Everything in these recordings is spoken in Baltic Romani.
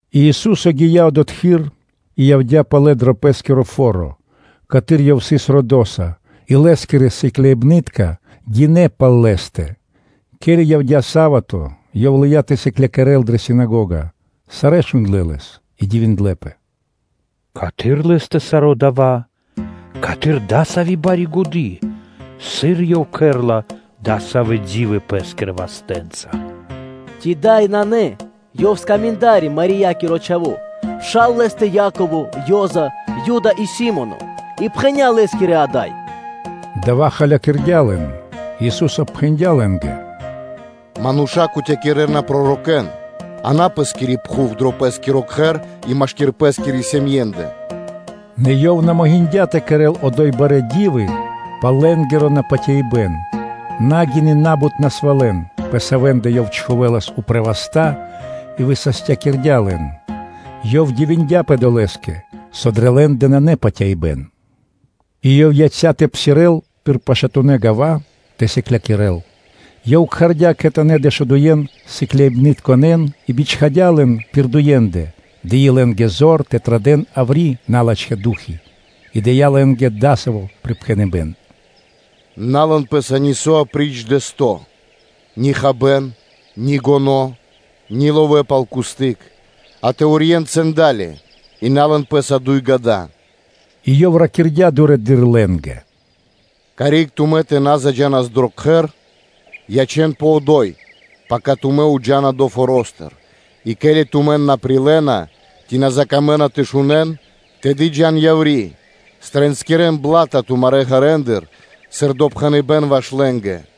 И Ису́со гия́ одотхы́р и явдя́ палэ дро пэ́скиро фо́ро, каты́р Ёв сыс родоса; и Лэ́скирэ сыкляибны́тка гинэ́ пал Лэ́стэ. Ке́ли явдя́ са́вато (субо́та), Ёв лыя́ тэ сыклякирэ́л дрэ синагога; сарэ́ шундлэ́ Лэс и дивиндлэ́пэ: “Каты́р Лэ́стэ саро́ дава́ исын? Каты́р исын дасави́ бари годы́? Сыр Ёв кэрэ́ла дасавэ́ ди́вы Пэ́скирэ вастэ́нца! Ци дава́ на Ёв исын скаминда́ри, Марьякиро чхаво́, а пша́ла Лэ́стэ Яково, Ёза, Юда и Си́моно? И пхэня́ Лэ́скирэ исын ада́й.” Дава́ холякирдя лэн. И Ису́со пхэндя́ лэ́нгэ: “Мануша́ кутякирэна (патывакирэна) пророкэ́н на пэ пэ́скири пхув, дро пэ́скиро кхэр и машки́р пэ́скирэ сэмэнцэндэ” На Ёв на могиндя́ тэ кэрэ́л одо́й барэ́ ди́вы пал лэ́нгиро напатяибэн, на гины на́бут насвалэн, пэ савэ́ндэ Ёв чхувэлас упрэ́ васта́ и высастякирдя́ лэн. Ёв дивиндяпэ долэ́стыр, со дрэ лэ́ндэ нанэ патяибэ́н. И Ёв яця́ тэ псирэ́л пир пашатунэ́ гава́ тэ сыклякирэ́л. Ёв кхардя́ кхэтанэ́ Дэшудуен сыкляибнытконэ́н и бичхадя́ лэн пир дуендэ; дыи лэ́нгэ зор тэ традэ́н яври́ налачхэ́ ду́хи; и дыя́ лэ́нгэ, акэ, саво́ припхэныбэ́н: “На лэн пэ́са нисо́, апри́ч дэсто́; ни хабэ́н, ни гоно́, ни ловэ́ пал кусты́к, а тэ урьен цуру́ли (цэндали), и на лэн пэ́са дуй гада. И Ёв ракирдя́ дурэды́р лэ́нгэ: “Карик тумэ́ тэ на заджанас дро кхэр, ячэ́нпэ одо́й, пака тумэ́ джа́на криг долэ́ форо́стыр; и ко́ли тумэн на прилэ́на, ци на закамэна тэ шунэ́н, тэды джа́н яври́, стринскирэн бла́та тумарэ́ ґэрэндыр сыр допхэныбэ́н ваш лэ́нгэ.”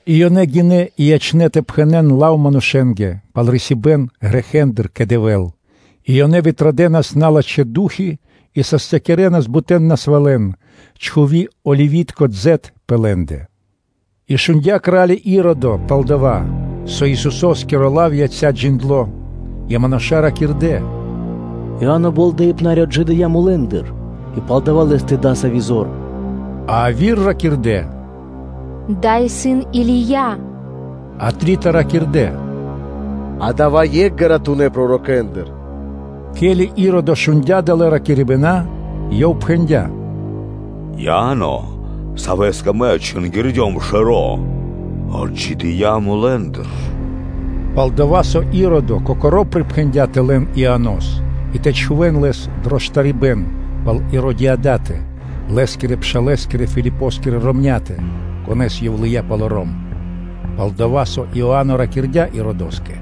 И ёнэ гинэ́ и ячнэ́ тэ пхэнэ́н лав манушэ́нгэ пал рисибэн грэхэ́ндыр кэ Дэвэ́л. И ёнэ традэнас яври налачхэ́ ду́хи и састякирэнас бутэ́ насвалэн, чхуви оливи́тко дзэт пэ лэ́ндэ. И шундя́ кра́ли Иродо пал дава́, пал-дова́ со Исусо́скиро лав яця́ джиндло́; и мануша́ ракирдэ́: “Иа́но Болдэипнари отджидыя́ мулэ́ндыр, и палдава́ лэ́стэ исын дасави́ зор. А яви́р ракирдэ́; “Дава́ исын Или́я.” А трита ракирдэ́: “Адава́ исын екх ґаратунэ́ пророкэндыр.” Ке́ли Иродо шундя́ далэ́ ракирибэна, ёв пхэндя́: “Иа́но, савэ́скэ мэ отчингирдём шэро́, отджидыя́ мулэ́ндыр.” Пал-дова́ со Иродо кокоро́ припхэндя́ тэ лэн Ианос и тэ чхувэ́н лэс дро штарибэ́н пал Иродиадатэ, лэ́скирэ-пшалэ́скирэ Филипоскирэ ромня́тэ, конэ́с ёв лыя́ палоро́м. Пал-дова́ со Иа́но ракирдя́ Иродоскэ: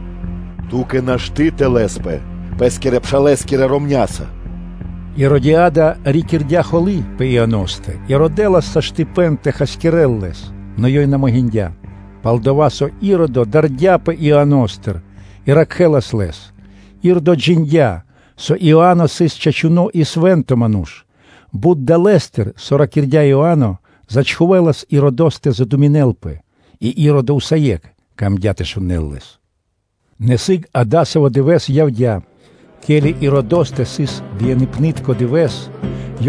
“Ту́кэ нашты́ тэ лэспэ пэ́скирэ-пшалэ́скирэ ромня́са.” Иродиада рикирдя холы́ пэ Ианостэ и родэлас саштыпэн (возможность) тэ хасякирэ́л лэс, нэ ёй на могиндя́, пал-дова́ со Иродо дардяпэ Иано́стыр и ракхэлас лэс; Иродо джиндя́, со Иа́но сыс чачуно́ и свэ́нто ману́ш; бут далэ́стыр, со ракирдя́ Иа́но, зачхувэлас Иродос тэ задуминэлпэ, и Иродо усае́кх мангдя́ тэ шунэ́л лэс. Нэ сыг, акэ, дасаво дывэ́с явдя́, ке́ли Иродостэ сыс бияныпнытко дывэ́с,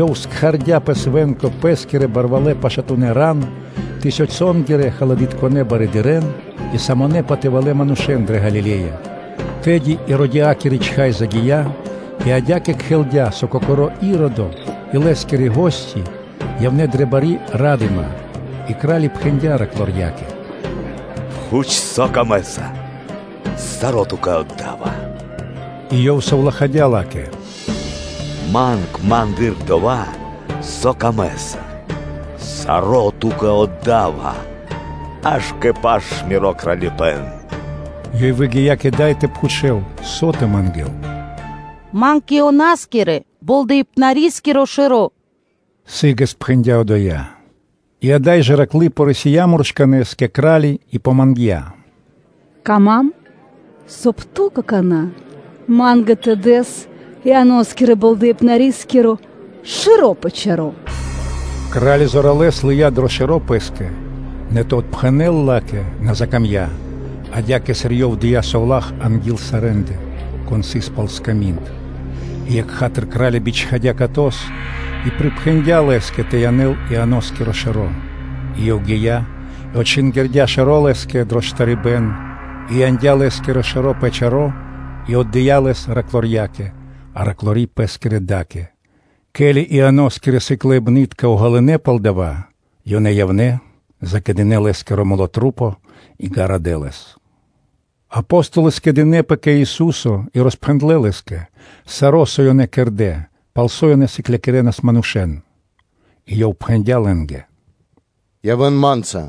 ёв кхардя́ пэ свэ́нко пэ́скирэ барвалэ́ пашатунэ́ ран, тысёнцэнгирэ-халадытконэ барыдырэ́н и самонэ патывалэ́ манушэ́н дрэ Галиле́я, тэды Иродиадакири чхай загия́ и адя́кэ кхэлдя, со кокоро́ Иродо и лэ́скирэ гости явнэ́ дрэ бари ра́дыма; и кра́ли пхэндя́ раклорьякэ: “Пхуч, со ту́кэ исын пир ило́? Саро́ ту́кэ мэ да́ва!” И ёв совлахадя́ ла́кэ: “Манг ма́ндыр дова́, со ту́кэ исын пир ило́, саро́ ту́кэ отда́ва! Аж кэ паш миро кралипэ́н!” Ёй выгия́ кэ дай тэ пхучэл, со тэ мангэ́л. “Манг Ианоскирэ-Болдэипнарискиро шэро́”, – сы́гэс пхэндя́ одоя. И ада́й жэ раклы рисия муршканэ́с кэ кра́ли и мангдя́: “Мангав, соб (кай) ту какана́ ма́нгэ тэ дэс Ианоскирэ-Болдэипнарискиро шэро́ пэ чаро́.” Кра́ли зоралэ́с лыя́ дро шэро́ пэ́скэ, нэ тэ отпхэнэл ла́кэ на закамдя́, адя́кэ сыр ёв дыя́ совла́х анги́л сарэ́ндэ, кон сыс пал сками́нд. И екха́тыр (сра́зу) кра́ли бичхадя́ катос и припхэндя́ лэ́скэ тэ янэл Ианоскиро шэро́. И ёв гия́ и отчингирдя шэро́ лэ́скэ дро штарибэ́н, и яндя́ Лэ́скиро шэро́ пэ чаро́ и отдыя́ лэс раклорьякэ; а раклори пэ́скирэ да́кэ. Ке́ли Ианоскирэ сыкляибны́тка уґалынэ пал дава́, ёнэ явнэ́, закэдынэ лэ́скиро тру́по и ґарадэ́ лэс. Апо́столы скэдынэ́пэ кэ Ису́со, и роспхэндлэ́ Лэ́скэ саро́, со ёнэ кэрдэ́, пал со ёнэ сыклякирэнас манушэ́н. И Ёв пхэндя́ лэ́нгэ: “Джа́н пэ биманушэнгиро штэ́то,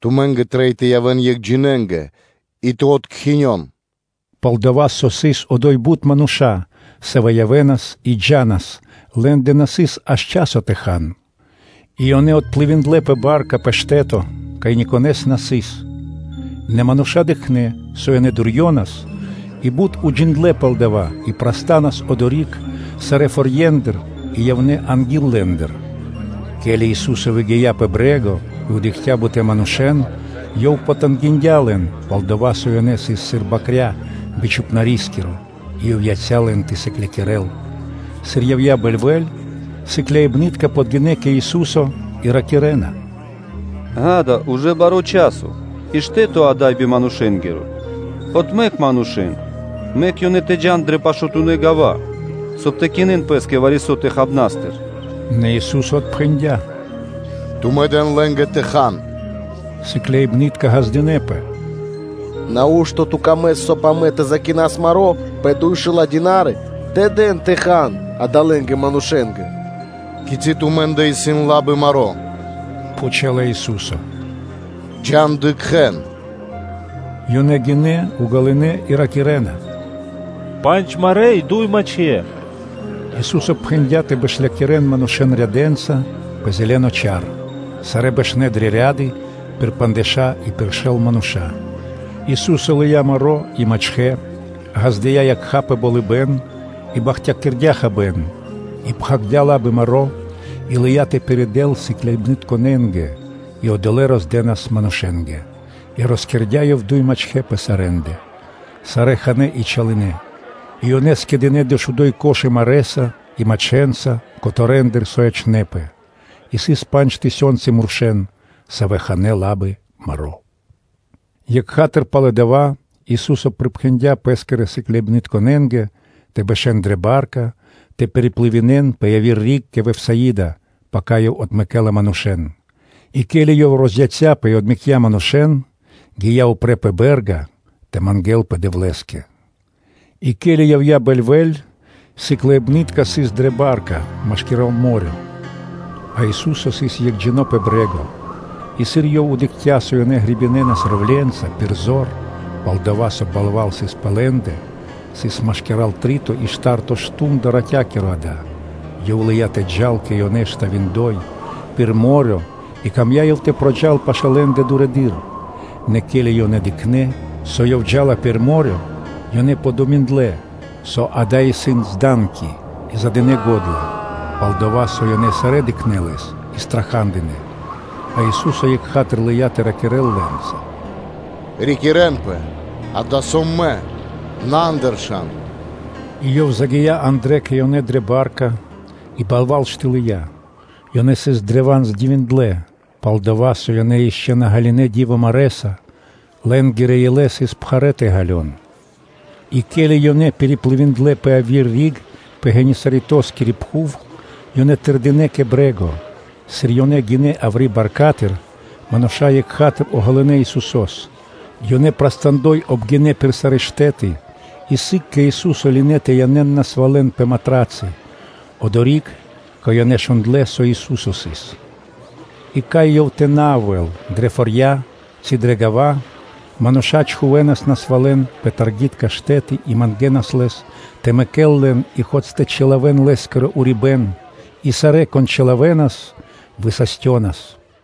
тумэ́нгэ трэй тэ явэ́н екхджинэ и тэ откхинён.” Пал-дова́, со сыс одо́й бут мануша́, савэ́ явэ́нас и джа́нас, лэ́ндэ на сыс аж часо тэ хан. И ёнэ отплывиндлэ (дынэ́ пли́ма дурэдыр) пэ ба́рка (лодка) пэ штэ́то, кай никонэ́с на сыс. Нэ мануша́ дыкхнэ́, со ёнэ дурьёнас, и бут уджиндлэ́ пал дава́ и прастанас одори́к сарэ́ форье́ндыр и явнэ́ анги́л лэ́ндэ. Ке́ли Ису́со выгия́ пэ брэ́го и дыкхця́ бут манушэ́н, Ёв потангиндя лэн, пал-дова́ со ёнэ сыс сыр бакря́ би чхупнарискиро; и Ёв яця́ лэн тэ сыклякирэ́л. Сыр явдя́ бэльвэ́ль, сыкляибны́тка подгинэ́ кэ Ису́со и ракирэ́на: “Ѓа́да, ужэ баро́ часо и штэ́то ада́й исын биманушэнгиро. Отмэк манушэ́н, мэк ёнэ тэ джа́н дрэ пашатунэ́ гава́, соб (кай) тэ кинэн пэ́скэ вари-со хабнастыр.” Нэ Ису́со отпхэндя́: “Тумэ́ дэн лэ́нгэ тэ хан.” Сыкляибны́тка ґаздынэ́пэ: “Нау́што Ту мыслинэса дро ило́, соб (кай) амэ тэ закинас маро́ пэ дуйшэла́ динарии тэ дас тэ хан адалэ́ манушэ́нгэ?” “Кицы́ тумэ́ндэ исын лабы маро́?, – пхучэла Ису́со, джа́н, дыкхэ́н.” Ёнэ гинэ́, уґалынэ, и ракирэ́на: “Пандж марэ́ и дуй мачхэ́.” Ису́со пхэндя́ тэ бэшлякирэн манушэ́н рядэнца пэ зэлэно чар. Сарэ́ бэшнэ́ дрэ ряды пир пандждэша́ и пир шэл мануша́. Ису́со лыя́ пандж марэ́ и дуй мачхэ́, ґаздыя́ якха́ пэ болыбэ́н и бахтякирдя́ хабэ́н, и пхагирдя́ лабы маро́ и лыя́ тэ пиридэл сыкляибнытконэ́нгэ и одолэ́ роздэнас манушэ́нгэ; и роскэрдя́ Ёв дуй мачхэ́ пэ сарэ́ндэ. Сарэ́ ханэ́ и чалынэ. И ёнэ скэдынэ́ дэшуду́й корзи́ны (кхудэ́) марэ́са и мачхэнца котэрэндыр (кускэндыр), со ячнэ́пэ. И сыс пандж тысёнцы мурша́, савэ́ ханэ́ лабы маро́. Екха́тыр (сра́зу) пало́ дава́ Ису́со припхэндя́ Пэ́скирэ сыкляибнытконэ́нгэ тэ бэшэ́н дрэ ба́рка тэ пириплывинэн (дэ́нас пли́ма пирдал) пэ яви́р риг кэ Вифсаида, пака Ёв отмэкэ́ла манушэ́н. И ке́ли Ёв розяцяпэ и отмэкця́ манушэ́н, то гия́ упрэ́ пэ бэ́рга тэ мангэ́лпэ Дэвлэ́скэ. И ке́ли явдя́ бэльвэ́ль, ба́рка сыс машкира́л мо́рё (дэрья́в), а Ису́со сыс екхджино́ пэ брэ́го. И сыр Ёв дыкхця́, со ёнэ гребинэнас вёслэнца (ровленца) пир зор, пал-дова́ со балва́л сыс пэ лэ́ндэ – сыс машки́р три́то и шта́рто мардо́ (шту́нда) ратя́киро, ґа́да, Ёв лыя́ тэ джал кэ ёнэ, штавиндой пир мо́рё (дэрья́в); и Ёв мыслиндя дро ило́ тэ проджал пашэ́ лэ́ндэ дурэды́р, нэ ке́ли ёнэ дыкхнэ́, со Ёв джа́ла пир мо́рё (дэрья́в), ёнэ думиндлэ (дынэ́ годы пэскэ), со дава́ сыс зданки и задынэ го́дла. Пал-дова́ со ёнэ сарэ́ дыкхнэ́ Лэс и страха́дынэ; а Ису́со екха́тыр лыя́ тэ ракирэ́л лэ́нца: “Рикирэнпэ муршканэ́с, дава́ сом Мэ. На андыршан!” И Ёв загия́ андрэ́ кэ ёнэ дрэ ба́рка, и балва́л штылыя. Ёнэ сыс древа́н здивиндлэ; пал-дова́ со ёнэ ишчо (инкэ́) на ґалынэ́ ди́во марэ́са, лэ́нгирэ илэ сыс пхарэ́ тэ ґалён. И ке́ли ёнэ пириплывиндлэ (дэ́нас пли́ма пирдал) пэ яви́р риг пэ Генисаретоскири пхув, ёнэ тэрдинэ́ кэ брэ́го. Сыр ёнэ гинэ́ яври́ баркатыр, мануша́ екха́тыр уґалынэ Исусо́с; ёнэ прастандой обгинэ пир сарэ́ штэ́ты и сыг кэ Ису́со лынэ́ тэ янэ́н насвалэн пэ матрацы одори́к, кай ёнэ шундлэ́, со Ису́со сыс. И кай Ёв тэ на явэ́лас дрэ фо́рья ци дрэ гава́, мануша́ чхувэ́нас насвалэн пэ штэ́ты яври́ [таргитка штэ́ты-ю.о.] и мангэнас Лэс тэ мэкэл лэн и мэк фэ́ни (хоць) тэ чилавэн Лэ́скиро урибэ́н; сарэ́, кон чилавэнас, одолэ́ высастёнас.